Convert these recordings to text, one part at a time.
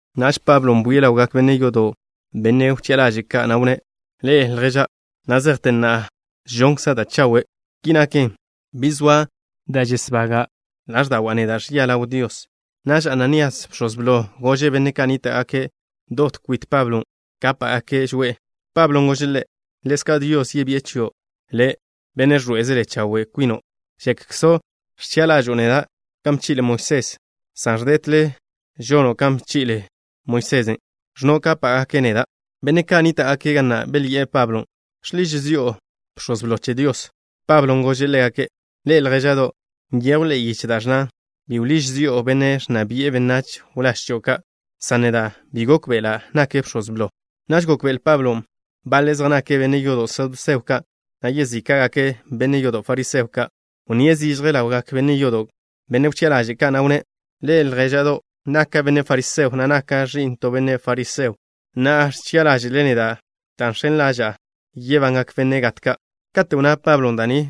Naž Pablon' bwie' ḻawgak benne' yodo', benne' wchi'a ḻaže' ka', na' wnné': —Ḻe'e, ljéža'do' ka'. Na' zejte na'a žonkza' da' chawe'. Ki naken, bi zoa da' žesbaga' ḻáẕda'wa' neda' ẕia ḻaw Dios. Naž Ananías, bx̱oz blo, gože' benne' ka' nníta'gake' dot kwit Pablon' kápa'gake' žoe'e. Pablon' gože' ḻe': —Ḻezka' Dios yebi'e chio' le', benne' ẕḻoé'ezele chawe' kwino'. ¿Že'kzo' ẕchi'a ḻažo'o neda' kan bchi'le Moisés, san ẕdetle žono' kan bchi'kzle Moisesen', ẕnno' kápa'gake' neda'? Benne' ka' nníta'gake' ga na' belyi'e Pablon': —¿Žḻiž zi'o bx̱oz blo che Dios? Pablon' gože' ḻégake': —Ḻe'e, ljéža'do' ka'. Nyejw ḻe'e yiche da' ẕnnan: “Bi wḻíž zi'o benne' ẕnna bi'e benách wláž chio' ka'” san neda' bi gókbe'ela' nake' bx̱oz blo. Naž gókbe'ele Pablon' baḻe' zej nake' benne' yodo' saduseo ka', na' yezíka'gake' benne' yodo' fariseo ka'. Wnníe' zižje ḻawgak benne' yodo', benne' wchi'a ḻaže' ka', na' wnné': —Ḻe'e, ljéža'do' ka'. Naka' benne' fariseo, na' naka' ẕi'n to benne' fariseo. Na'a ẕchi'a ḻáže'le neda' dan' žx̱en ḻaža'a yebangak benne' gat ka'. Kate' wnná Pablon' da' ni,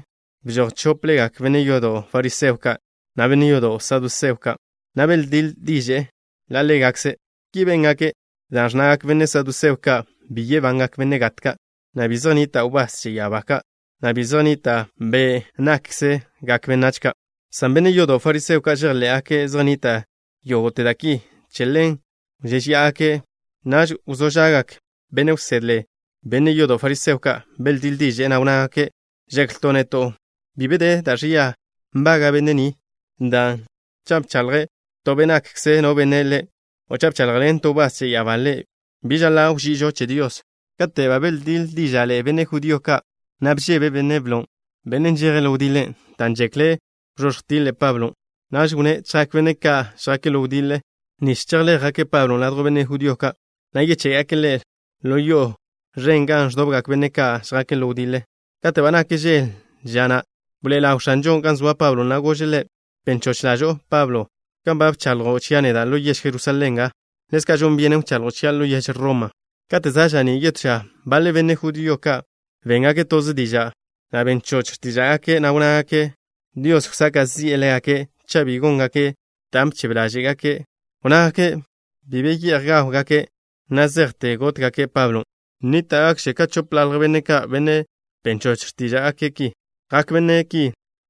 bžoj chóplegak benne' yodo' fariseo ka', na' benne' yodo' saduseo ka', na' beldíḻ diže'e ḻa' ḻégakze'. Ki béngake' dan' ẕnnagak benne' saduseo ka' bi yebangak benne' gat ka', na' bi zej nnita' wbás che ya'abá ka', na' bi zej nnita' be' nákgakkze benách ka', san benne' yodo' fariseo ka' žejḻé'gake' zej nnita' yógo'te da' ki. Che ḻen wžéžeya'agake'. Naž wzó ža'gak benne' wsedle, benne' yodo' fariseo ka'. Beldíḻ diže'e, na' wnnágake': —Žeklto' neto' bi be da' ẕia nbaga' benne' ni, dan' cha' bchaḻjḻen to be' nakkze no benne' ḻe', o cha' bchaḻjḻen to wbás che ya'abá ḻe', bi žaḻa' wži'ižo che Dios. Kate' ba beldíḻ díža'ḻe'e benne' judío ka', na' bžebe benne' blon', benne' žeje' ḻo wdiḻe, dan' žekle' wzóẕj tiḻe' Pablon'. Naž wnné' chjak benne' ka' žjake' ḻo wdiḻe, nich chejbéjgake' Pablon' ladjw benne' judío ka', na' yeché'gake' ḻe' ḻo yo'o ẕen gan ẕdobgak benne' ka' žjake' ḻo wdiḻe. Kate' ba nak žel ža na'ze, bḻoe'e ḻaw X̱anžon' gan zoa Pablon', na' gože' ḻe': —Ben choch ḻažo'o, Pablo. Kan ba bchaḻjo' chia' neda' ḻo yež Jerusalén nga, ḻezka' žon byenen wchaḻjo' chia' ḻo yež Roma. Kate' za' ža'ní' yetó ža, baḻe benne' judío ka' béngake' toze diža', na' ben choch x̱tíža'gake', na' wnnágake' Dios wsaka' zi'e ḻégake' cha' bi góngake' dan' bchebe ḻáže'gake'. Wnnágake' bi be ye'j gáwgake' na' zejte gótgake' Pablon'. Nníta'gakže ka chopḻalj benne' ka', benne' ben choch x̱tíža'gake' ki. Jak benne' ki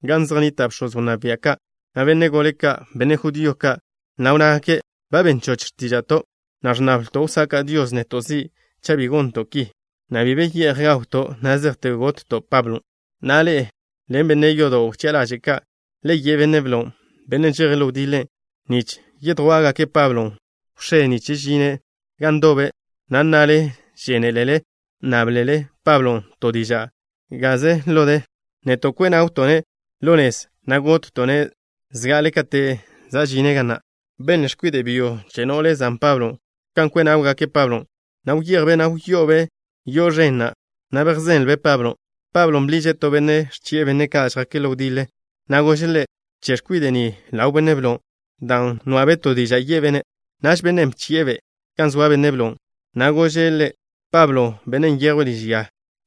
gan zej nnita' bx̱oz wnná bia' ka', na' benne' gole ka', benne' judío ka', na' wnnágake': —Ba ben choch x̱tíža'to', na' ẕnnabto' wsaka' Dios neto' zi' cha' bi gonto' ki, na' bi be ye'j gawto' na' zejte gotto' Pablon'. Na'a, ḻe'e ḻen benne' yodo' wchi'a ḻaže' ka', le ye' benne' blon', benne' žeje' ḻo wdiḻe, nich yedjwá'gake' Pablon' wx̱é, nich žine' gan ndoble, na' nnale žénelele nnáblele Pablon' to diža' gaze ḻo de. Neto' kwe' nawto'-ne' ḻa' nez, na' gotto'-ne' zga'ale kate' žine' nga. Benle x̱kwide' byo che no'le zan Pablon' kan kwe' náwgake' Pablon', na' wyejbe', na' wyo'obe' yo'o ẕen na', na' bejzenlben' Pablon'. Pablon' bḻiže' to benne' ẕchi'e benne' ka' žjake' ḻo wdiḻe, na' gože' ḻe': —Bche' x̱kwide' ni ḻaw benne' blo, dan' nwa'be' to diža' ye'be'-ne'. Naž bennen' bchi'e-be' gan zoa benne' blon', na' gože' ḻe': —Pablo, bennen' nyejwe' liž ya,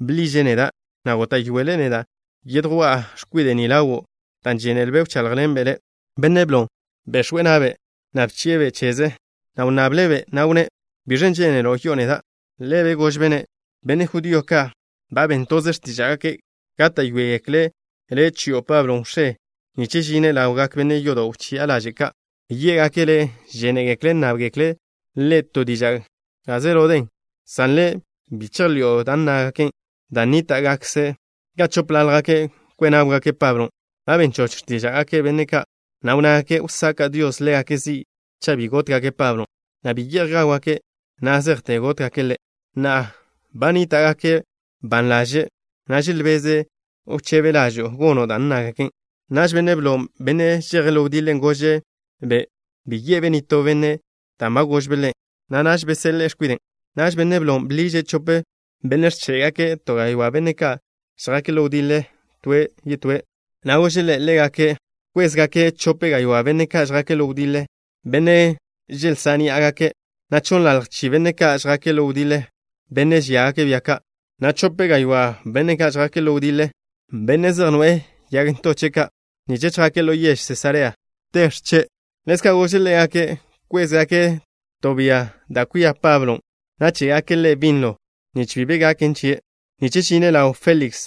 bḻiže' neda', na' góta'yoele' neda' yedjwá'a x̱kwide' ni ḻawo', dan' žénelbe' wcháḻjḻenbe' le'. Benne' blon' bex̱we' na'be', na' bchi'e-be' cheze, na' wnnable'-be', na' wnné': —¿Biẕen' žénelo' yi'o neda'? Ḻebe' gožbe'-ne': —Benne' judío ka' ba ben toze x̱tíža'gake' gáta'yoegekle' le' chi'o Pablo wx̱é, nich žine' ḻawgak benne' yodo' wchi'a ḻaže' ka'. Yé'gake' le' žénegekle' nnábgekle' ḻe' to diža' gaze ḻo de, san le', bi chejḻi'o dan' nnágake', dan' nníta'gakže ka chópḻaljgake' kwe' náwgake' Pablon'. Ba ben choch x̱tíža'gak benne' ka', na' wnnágake' wsaka' Dios ḻégake' zi' cha' bi gótgake' Pablon', na' bi be ye'j gáwgake' na' zejte gótgake' ḻe'. Na'a, ba nníta'gake' ban ḻaže', na' želbeze' wchebe ḻažo'o gono' dan' nnábgekle' le'. Naž benne' blon', benne' žeje' ḻo wdiḻe, gože'-be' bi ye'be' nitó benne' dan' ba gožbe' ḻe', na' naž beseḻe'e x̱kwiden'. Naž benne' blon' bḻiže' chope benne' ẕché'gake' to gaywá' benne' ka' žjake' ḻo wdiḻe to toe', na' gože' ḻégake' wkwézgake' chope gaywá' benne' ka' žjake' ḻo wdiḻe, benne' želzá' ní'agake', na' chonnḻalj chi benne' ka' žjake' ḻo wdiḻe, benne' žíagake' bia ka', na' chope gaywá' benne' ka' žjake' ḻo wdiḻe, benne' zej noe'e yag ntoche' ka', nich chjake' ḻo yež Sesarea te x̱che'. Ḻezka' gože' ḻégake' wkwézgake' to bia, da' kwia Pablon', na' ché'gake' ḻe' binlo, nich bi be gaken chie', nich žine' ḻaw Féliks,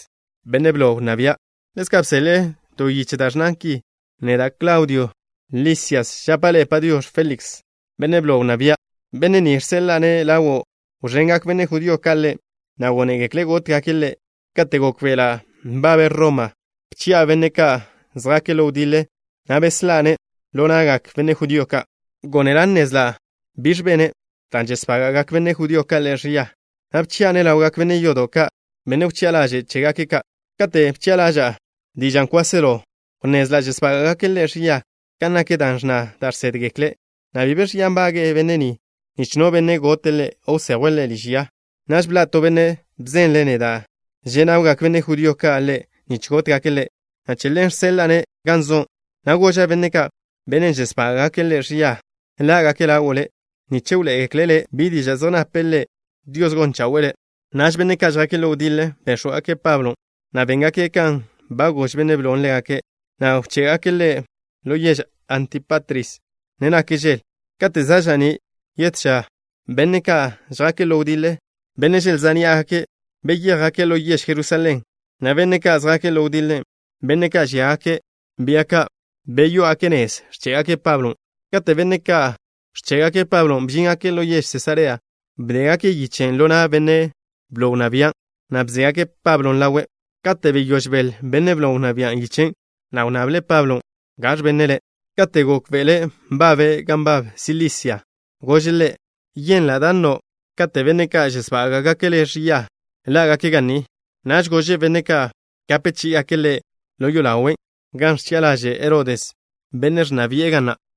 benne' blo wnná bia'. Ḻezka' bseḻe'e to yiche da' ẕnnan ki: “Neda', Klaudio Lisias, žapa' le': Padiox̱ Féliks, benne' blo wnná bia'. Benne' ni žseḻa'a-ne' ḻawo', wẕengak benne' judío ka' ḻe', na' gónegekle' gótgake' ḻe'. Kate' gókbe'ela' nbabe' Roma, bchi'a benne' ka' žjake' ḻo wdiḻe, na' beslá'-ne' ḻo na'gak benne' judío ka'. Gónela' nnezla' biẕ bene', dan' žesbága'gak benne' judío ka' ḻe' ẕia, na' bchi'a-ne' ḻawgak benne' yodo' ka', benne' wchi'a ḻaže' chégake' ka'. Kate' bchi'a ḻaža'a dižan' kwáselo, wnnezla' žesbága'gake' ḻe' ẕia kan nak da' ẕnna da' žsédgekle', na' bi be ẕia nbaga' benne' ni, nich no benne' gote' ḻe', o wsejwe' ḻe' liž ya. Naž bḻa' to benne' bzenle' neda' že' nawgak benne' judío ka' ḻe' nich gótgake' ḻe', na' che ḻen žseḻa'a ḻe' gan zo', na' goža' benne' ka', benne' žesbága'gake' ḻe' ẕia ḻá'gake' ḻawo' le', nich wḻoé'egekle' le' bi diža' zej nape' ḻe'. Dios gon chawe'e le'.” Naž benne' ka' žjake' ḻo wdiḻe béx̱wgake' Pablon', na' béngake' kan ba gož benne' blon' ḻégake', na' bché'gake' ḻe' ḻo yež Antípatris, ne nak žel. Kate' za' ža'ní' yetó ža benne' ka' žjake' ḻo wdiḻe, benne' želzá' ní'agake', beyéjgake' ḻo yež Jerusalén, na' benne' ka' žjake' ḻo wdiḻe, benne' ka' žíagake' bia ka', beyó'ogake' nez, ẕché'gake' Pablon'. Kate' benne' ka' ẕché'gake' Pablon' bžíngake' ḻo yež Sesarea, bdégake' yichen' ḻo na' benne' blo wnná bian', na' bzégake' Pablon' ḻawe'. Kate' beyóž beḻ benne' blo wnná bian' yichen', na' wnnable' Pablon' gaẕ benne' ḻe'. Kate' gókbe'ele' nbabe' gan nbab Silisia, gože' ḻe': —Yenla' da' nno' kate' benne' ka' žesbága'gake' le' ẕia ḻá'gake' ga ni. Naž gože' benne' ka' gape chí'igake' ḻe' ḻo yolawe' gan ẕchi'a ḻaže' Herodes, benne' ẕnna bi'e ga na'.